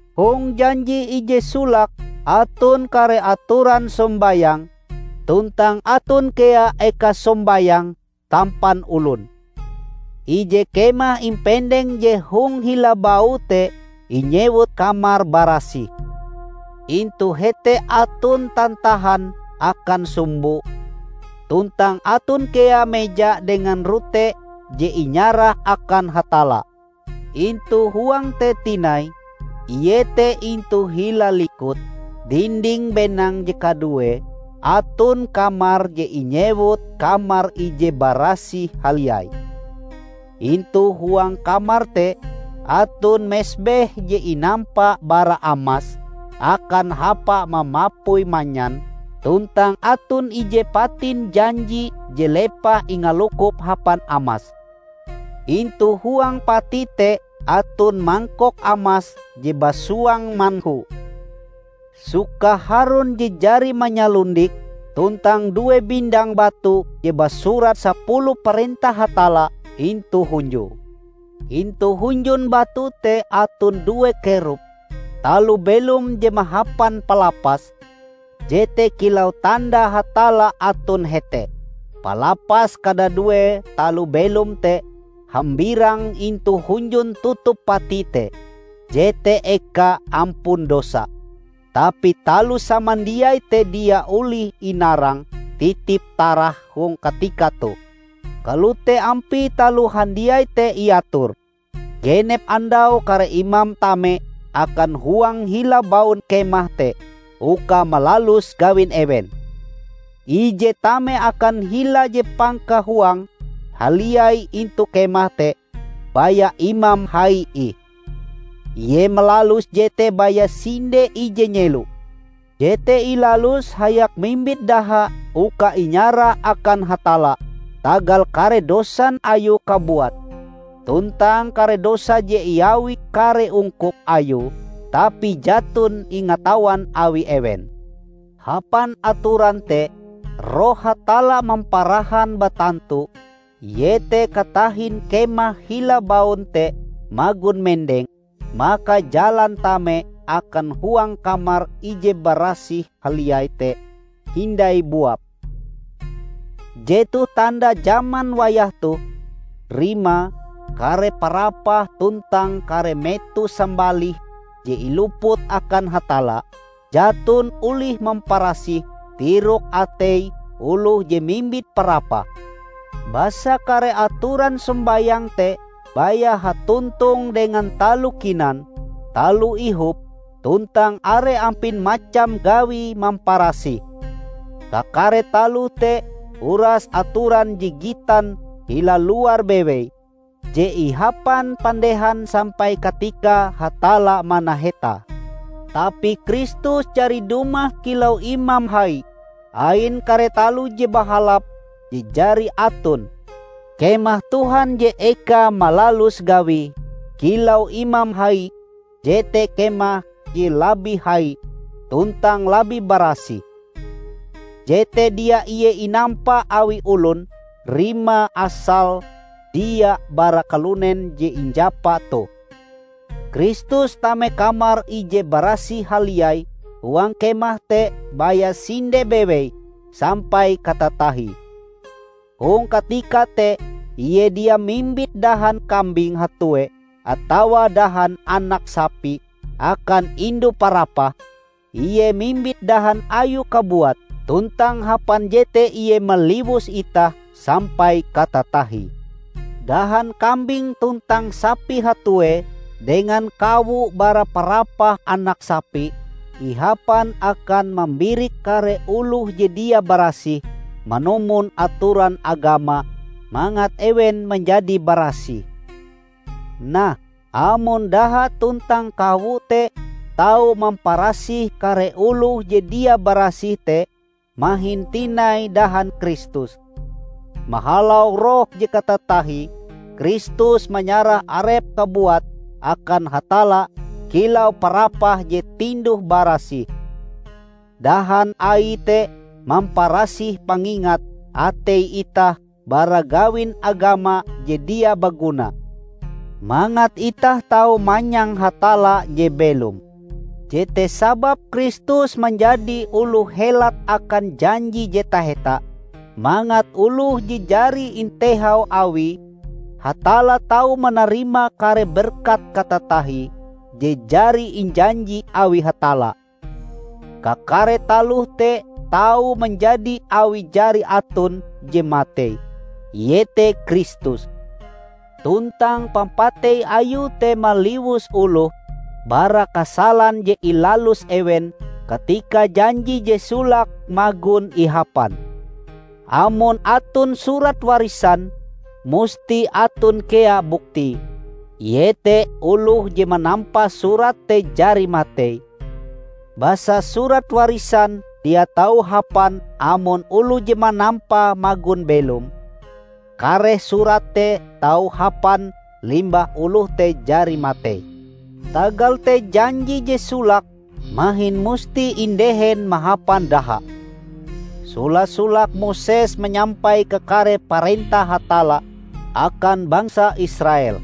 Hong janji ije solake aton kare atoran sombayang, tuntang aton kea eka sombayang tampan olon. Ije kemah impendeng je hong hila baue te inyewut Kamar Barasih. Intu hete aton tantahan akan sumbo, tuntang aton kea meja dengan rote je inyarah akan Hatalla. Intu huange te tinai, iete intu hila likut dinding benang je kaduee, aton kamar je inyewut Kamar Ije Barasih Haliai. Intu huang kamar te aton mesbeh je inampa bara amas akan hapa mamapui manyan, tuntang aton ije Patin Janji je lepah ingalukop hapan amas. Intu huang pati te aton mangkok amas je basuang manhu, sukah Harun je jari manyalundik, tuntang due bindang batu je basurat sapuluh parentah Hatalla intu hunjue. Intu hunjun batu te aton due Kerub, taloh belom je mahapan palapas, jete kilau tanda Hatalla aton hete. Palapas kadadue taloh belom te hambirang intu hunjun tutup pati te, jete eka ampun dosa. Tapi taloh samandiai te dia olih inarang titip-tarah hong katika toh. Kalote ampie taloh handiai te iator. Genep andau kare imam tame akan huang hila baun kemah te uka malalus gawin ewen. Ije tame akan hila je pangkahuange haliai intu kemah te baya imam hai ih. Ie malalus jete baya sinde ije nyelo. Jete ilaluse hayak mimbit daha uka inyarah akan Hatalla tagal kare dosan ayue kabuat tuntang kare dosa je iawi kare ungkup ayue tapi jaton ingatawan awi ewen. Hapan atoran te, Roh Hatalla mamparahan batantu, iete katahin kemah hila baun te magon mendeng, maka jalan tame akan huang Kamar Ije Barasih Haliai te hindai buap. Jetoh tanda jaman wayah toh; rimae, kare parapah tuntang kare meto sambalih je iluput akan Hatalla, jaton olih mamparasih tirok atei oloh je mimbit parapah. Basa kare atoran sombayang te baya hatontong dengan taloh kinan, taloh ihop, tuntang are ampin macam gawi mamparasih. Kakare taloh te uras atoran je gitan hila luar bewei je ihapan pandehan sampai katikae Hatalla manahetae. Tapi Kristus jari dumah kilau Imam Hai ain kare taloh je bahalap je jari aton. Kemah Tuhan je ekae malalus gawie kilau Imam Hai jete kemah je labih hai tuntang labih barasih. Jete dia ie inampa awi olon; rimae asale dia bara kalunen je injapa toh. Kristus tame Kamar Ije Barasih Haliai huang Kemah te baya sinde bewei sampai katatahie. Hong katika te Ie dia mimbit dahan kambing hatuee atawa dahan anak sapi akan indu parapahe; Ie mimbit dahan Ayue kabuat, tuntang hapan jete Ie maliwus itah sampai katatahie. Dahan kambing tuntang sapi hatuee dengan kawo bara parapah anak sapi, ihapan akan mambirik kare oloh je dia barasih manumon atoran agama mangat ewen manjadi barasih. Nah, amon daha tuntang kawo te tau mamparasih kare oloh je dia barasih te, mahin tinai dahan Kristus! Mahalau Roh je katatahie, Kristus manyarah Arepe kabuat akan Hatalla kilau parapah je tinduh-barasih. Dahan Aie te mamparasih pangingat atei itah bara gawin agama je dia baguna, mangat itah tau manyang Hatalla je belom. Jete sababe Kristus manjadi oloh helat akan janji je taheta, mangat oloh je jari intehau awi Hatalla tau manarima kare berkat katatahie je jari injanji awi Hatalla. Kakare taloh te tau manjadi awi jari aton je matei, iete Kristus; tuntang pampatei Ayue te maliwus oloh bara kasalan je ilalus ewen katika janji je solake magon ihapan. Amon aton surat warisan, musti aton kea buktie, iete oloh je manampa surat te jari matei. Basa surat warisan dia tau hapan amon oloh je manampae magon belom. Kareh surat te tau hapan limbah oloh te jari matei. Tagal te janji je solake mahin musti indehen mahapan daha. Sola-solake Moses manyampai kakare parentah Hatalla akan bangsa Israel.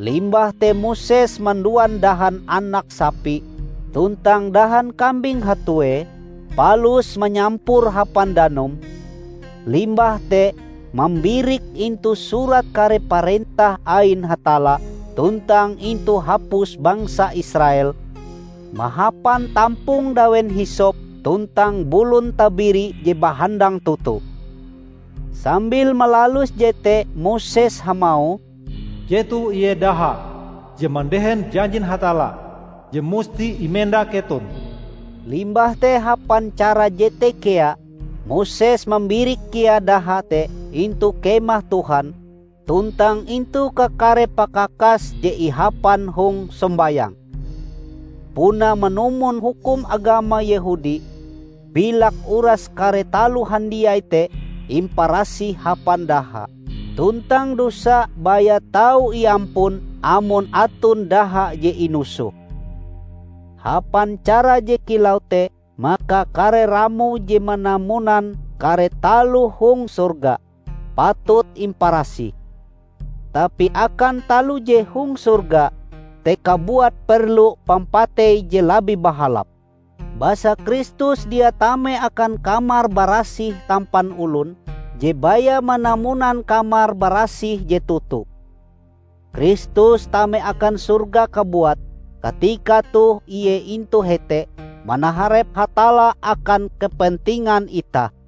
Limbah te Moses manduan dahan anak sapi tuntang dahan kambing hatuee, palus manyampure hapan danum, limbah te mambirike intu Surat Kare Parentah ain Hatalla tuntang intu hapus bangsa Israel mahapan tampong dawen hisop tuntang bulun tabiri je bahandang toto. Sambil malalus jete Moses hamauh, "Jetoh ie daha je mandehen janjin Hatalla je musti imenda keton." Limbah te hapan cara jete kea, Moses mambirik kea daha te intu Kemah Tuhan tuntang intu kakare pakakas je ihapan hong sombayang. Puna manumon hukum agama Yehudi, bilak uras kare taloh handiai te imparasih hapan daha; tuntang dosa baya tau iampun amon aton daha je inusoh. Hapan cara je kilau te maka kare ramo je manamunan kare taloh hong sorga, patut imparasih. Tapi akan taloh je hong sorga te kabuat perlu pampatei je labih bahalap. Basa Kristus dia tame akan Kamar Barasih tampan olon, je baya manamunan Kamar Barasih je toto. Kristus tame akan sorga kabuat; katika toh Ie intu hete manaharep Hatalla akan kepentingan itah.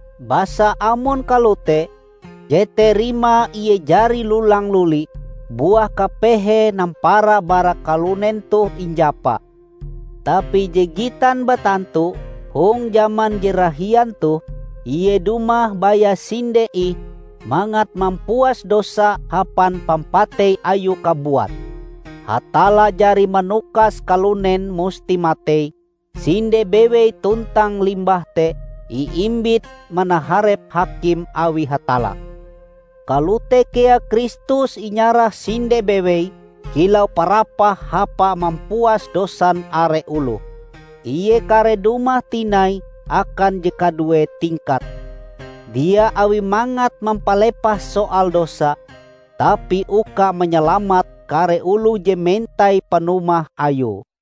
Basa amon kalote, jete rimae Ie jari lulang-luli buah kapehe nampara bara kalunen toh injapa. Tapi je gitan batantu, hong jaman je rahian toh, Ie dumah baya sinde ih mangat mampuas dosa hapan pampatei Ayue kabuat. Hatalla jari manukas kalunen musti matei sinde bewei tuntang limbah te iimbit manaharep hakim awi Hatalla. Kalote kea Kristus inyarah sinde bewei kilau parapah hapa mampuas dosan are oloh. Ie kareh dumah tinai akan je kadue tingkate, dia awi mangat mampalepah soal dosa, tapi uka manyalamat kare oloh je mentai panumah Ayue.